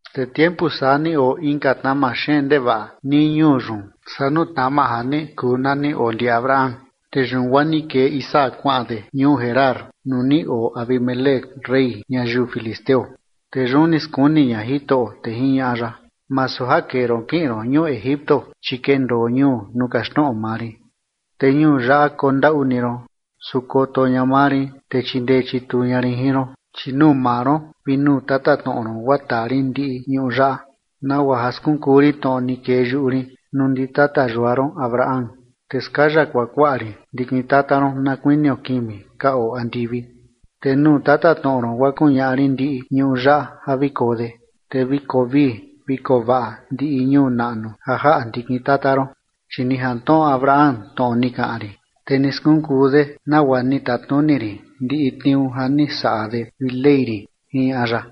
Te tiempu saa ni oo inka tnama xeen ndevaꞌa nii ñuu yun saa nuu tnama ja ni kuu na ni oo ndi Abraham. Te yun guaa ni kee Isaac kuaꞌan de ñuu Gerar nuu ni oo Abimelec rey ñayiu filisteo. Te yun ni skuni ña Jitoꞌo, te jiñaꞌa ya: ―Masu ja kee ron kiꞌin ron ñuu Egipto, chi kendoo ñuu nuu kaxtnoꞌo maa rin. Te ñuu yaꞌa kondaꞌu ni ron, su koto ña maa rin, te chindee chituu ña rin jin ron, chi nuu maa ron, vi nuu tatatnoꞌo ron guaa taa rin ndiꞌi ñuꞌu yaꞌa nagua ja skunkuu rin tnoꞌo ni kee yuꞌu rin nuu ndi tata yua ron Abraham. Te skaya kuakuaꞌa rin ndikin tata ron na kuinio kimi ka oo andivi. Te nuu tatatnoꞌo ron guaa kuñaꞌa rin ndiꞌi ñuꞌu yaꞌa ja vi koo de, te vi koo vii vi koo vaꞌa ndiꞌi ñuu naꞌnu ja jaꞌa ndikin tata ron. Chi ni jantnoꞌo Abraham tnoꞌo ni kaꞌan rin, te ni skunkuu de nagua ni tatnuni rin ndiꞌi tniuu ja ni saꞌa de vi ley rin ―jiñaꞌa ya.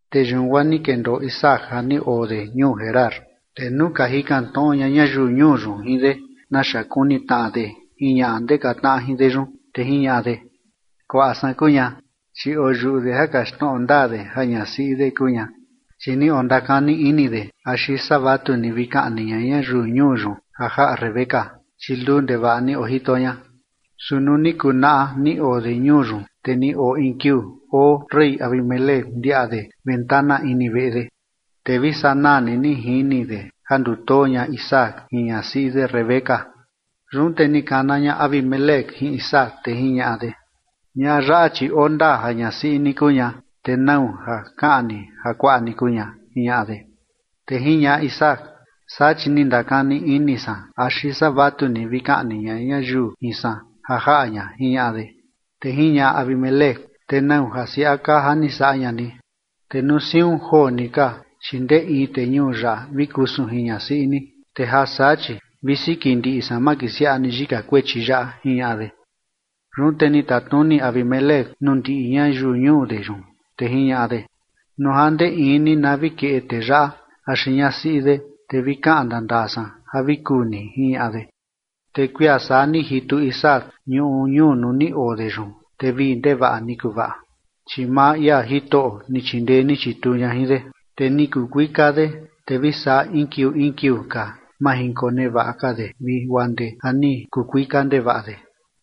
Te yun guaa ni kendoo Isaac ja ni oo de ñuu Gerar. Te nuu ka jikan tnoꞌo ña ñayiu ñuu yun jin de naxa kuni tnaꞌa de jin ñaꞌa ndeka tnaꞌa jin de yun, te jiñaꞌa de: ―Kuaꞌa san kuu ña. Chi oyuꞌu de ja kaxtnoꞌo ndaa de ja ñasiꞌi de kuu ña, chi ni ondakani ini de axi saa vatu ni vi kaꞌni ña ñayiu ñuu yun ja jaꞌa Rebeca, chi luu ndevaꞌa ni ojito ña. Su nuu ni kunaꞌa ja ni oo de ñuu yun, te ni oo in kiuu oo rey Abimelec ndiaꞌa de ventana ini veꞌe de, te vi sanaa ni jini de ja ndutoo ña Isaac jin ñasiꞌi de Rebeca. Yun te ni kana ña Abimelec jin Isaac, te jiñaꞌa de: ―Ñaꞌa yaꞌa, chi oo ndaa ja ñasiꞌi ni kuu ña, te ¿nau ja kaꞌan ni ja kuaꞌa ni kuu ña? ―jiñaꞌa de. Te jiñaꞌa Isaac: ―Saa chi ni ndakani ini san axi saa vatu ni vi kaꞌni ña ñayiu jin san ja jaꞌa ña ―jiñaꞌa de. Te jiñaꞌa Abimelec: ―¿Te nau ja siaꞌa kaa ja ni saꞌa ña ni? Te nuu siun joo ni ka, chi ndee in tee ñuu yaꞌa vi kusun jin ñasiꞌi ni, te ja saa chi vi siki ndiꞌi san makisiaꞌa ni yika kuechi yaꞌa ―jiñaꞌa de. Yun te ni tatnuni Abimelec nuu ndiꞌi ñayiu ñuu de yun, te jiñaꞌa de: ―Nuu ja ndee in ni na vi keꞌe tee yaꞌa axi ñasiꞌi de, te vi kaꞌan ndaa ndaa san ja vi kuu ni ―jiñaꞌa de. Te kuia saa ni jitu Isaac ñuꞌu ñuu nuu ni oo de yun, te vii ndevaꞌa ni kuvaꞌa, chi maa ia Jitoꞌo ni chindee ni chituu ña jin de. Te ni kuu kuika de, te vi saa in kiuu in kiuu ka majinkonevaꞌa ka de vi guaa ndee ja ni kuu kuika ndevaꞌa de.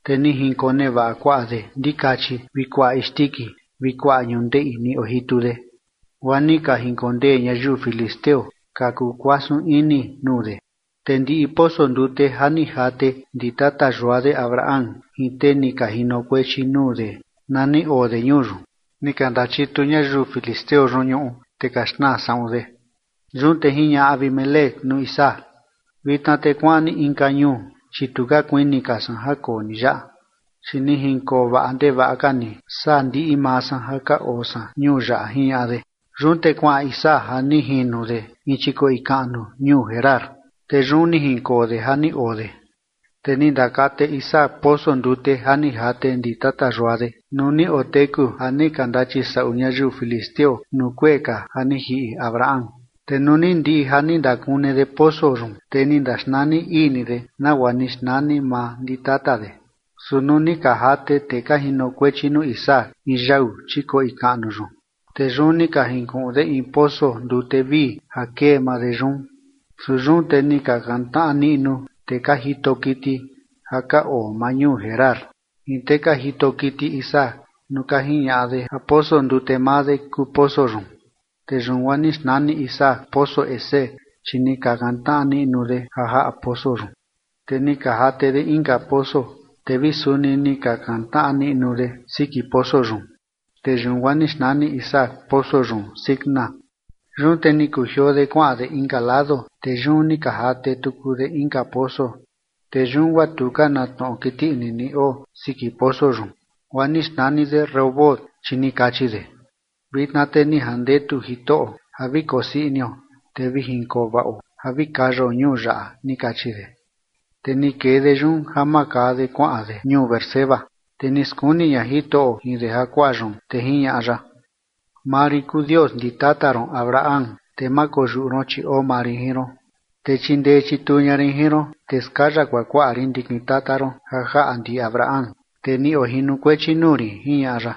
Te ni jinkonevaꞌa kuaꞌa de ndikachi vi kuaꞌa isndiki vi kuaꞌa ñundeꞌi ni ojitu de, guaa ni ka jinkondee ñayiu filisteo ka kuu kuasun ini nuu de. Te ndiꞌi poso ndute ja ni jate ndi tata yua de Abraham jin tee ni ka ojinokuechi nuu de na ni oo de ñuu yun, ni ka ndachitu ñayiu filisteo yun ñuꞌu, te ka xnaa saꞌun de. Yun te jiñaꞌa Abimelec nuu Isaac: ―Vitna te kuaꞌan ni inka ñuu, chi tu ka kuini ka san ja koo ni yaꞌa, chi ni jinkovaꞌa ndevaꞌa ka ni saa ndiꞌi maa san ja ka oo san ñuu yaꞌa ―jiñaꞌa de. Yun te kuaꞌan Isaac ja ni jino de in chikoꞌi kaꞌnu ñuu Gerar, te yun ni jinkoo de ja ni oo de. Te ni ndakate Isaac poso ndute ja ni jate ndi tata yua de nuu ni oteku ja ni ka ndachisaꞌu ñayiu filisteo nuu kuee ka ja ni jiꞌi Abraham, te nuu ni ndiꞌi ja ni ndakune de poso yun, te ni ndaxnani ii ni de nagua ni xnani maa ndi tata de. Su nuu ni ka jate tee ka jinokuechi nuu Isaac in yau chikoꞌi kaꞌnu yun, te yun ni ka jinkuꞌun de in poso ndute vii ja kee maa de yun. Su yun te ni ka kantnaꞌa niꞌnu tee ka jito kiti ja ka oo maa ñuu Gerar jin tee ka jito kiti Isaac nuu ka jiñaꞌa de ja poso ndute maa de kuu poso yun. Te yun guaa ni xnani Isaac poso Esek, chi ni ka kantnaꞌa niꞌnu de ja jaꞌa poso yun. Te ni ka jate de inka poso, te vi suni ni ka kantnaꞌa niꞌnu de siki poso yun, te yun guaa ni xnani Isaac poso yun Sitna. Yun te ni kujioo de kuaꞌan de inka lado, te yun ni ka jate tuku de inka poso, te yun guaa tu ka na tnoꞌo kiti ini ni oo siki poso yun, guaa ni xnani de Rehobot, chi ni kachi de: ―Vitna te ni jandetu Jitoꞌo ja vi kosii inio te vi jinkoo vaꞌo ja vi kayao ñuu yaꞌa ―ni kachi de. Te ni kee de yun ja makaa de kuaꞌan de ñuu Beerseba. Te ni skuni ña Jitoꞌo jin de jakuaa yun, te jiñaꞌa ya: Maa rin kuu Dios ndi tata ron Abraham. Te ma koyuꞌu ron, chi oo maa rin jin ron, te chindee chituu ña rin jin ron, te skaya kuakuaꞌa rin ndikin tata ron ja jaꞌa ndi Abraham, tee ni ojinokuechi nuu rin, jiñaꞌa ya.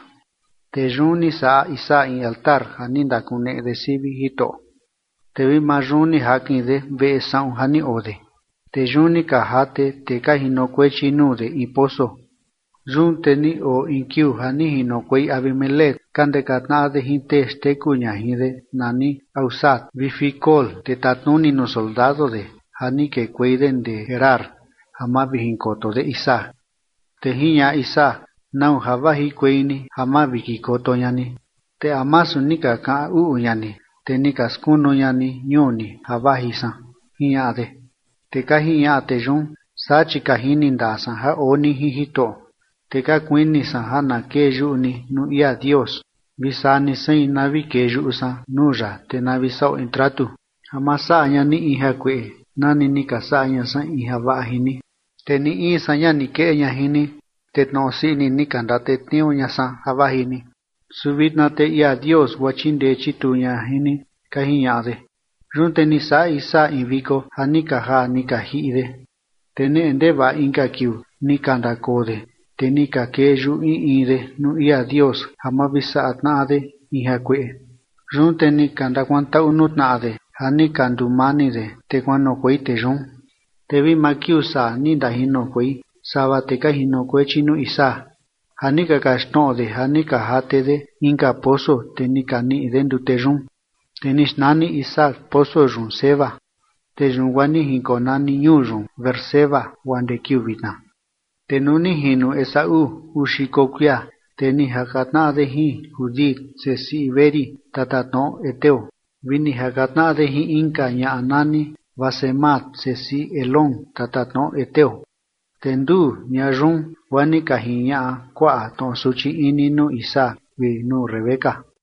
Te yun ni saꞌa Isaac in altar ja ni ndakakuneꞌe de sivi Jitoꞌo. Te vi maa yun ni jakin de veꞌe saꞌun ja ni oo de. Te yun ni ka jate tee ka jinokuechi nuu de in poso. Yun te ni oo in kiuu ja ni jinokuei Abimelec ka ndeka tnaꞌa de jin tee xteku ña jin de nani Ahuzat vi Ficol tee tatnuni nuu soldado de ja ni kekuei de ndee Gerar ja mavijinkoto de Isaac. Te jiñaꞌa Isaac: ―¿Nau ja vajikuei ni ja mavikikoto ña ni, te a masu ni ka kaꞌan uꞌu ña ni, te ni ka skunu ña ni ñuu ni ja vaji san? ―jiñaꞌa de. Te ka jiñaꞌa tee yun: ―Saa chi ka jini ndaa san ja oo ni jin Jitoꞌo, te ka kuini san ja na kee yuꞌu ni nuu ia Dios vi saa ni sein na vi kee yuꞌu san nuu ya, te na vi saꞌo in tratu, ja ma saꞌa ña ni in jakueꞌe nani ni ka saꞌa ña san in javaꞌa jin ni. Te ni in san ña ni keꞌe ña jin ni, te tnoꞌo sii ini ni ka ndatetniuu ña san ja vaji ni. Su vitna te ia Dios, guaa chindee chituu ña jin ni ―ka jiñaꞌa de. Yun te ni saꞌa Isaac in viko ja ni ka jaa ni ka jiꞌi de. Te neꞌe ndevaꞌa inka kiuu ni ka ndakoo de, te ni ka kee yuꞌu in in de nuu ia Dios ja ma vi saꞌa tnaꞌa de in jakueꞌe. Yun te ni ka ndakuantaꞌu nuu tnaꞌa de ja ni ka nduu mani de, te kuanoꞌokuei tee yun. Te vi maa kiuu saa ni ndajinokuei sava tee ka jinokuechi nuu Isaac ja ni ka kaxtnoꞌo de ja ni ka jate de inka poso, te ni ka niꞌi de ndute yun. Te ni xnani Isaac poso yun Seba. Te yun guaa ni jinkonani ñuu yun Beerseba guaa ndee kiuu vitna. Te nuu ni jino Esaú uu xiko kuia, te ni jaka tnaꞌa de jin Judit sesiꞌi Beeri, tatatnoꞌo heteo, vi ni jaka tnaꞌa de jin inka ñaꞌa nani Basemat sesiꞌi Elón tatatnoꞌo heteo. Te nduu ñaꞌa yun guaa ni ka jiñaꞌa kuaꞌa tnoꞌo suchi ini nuu Isaac vi nuu Rebeca.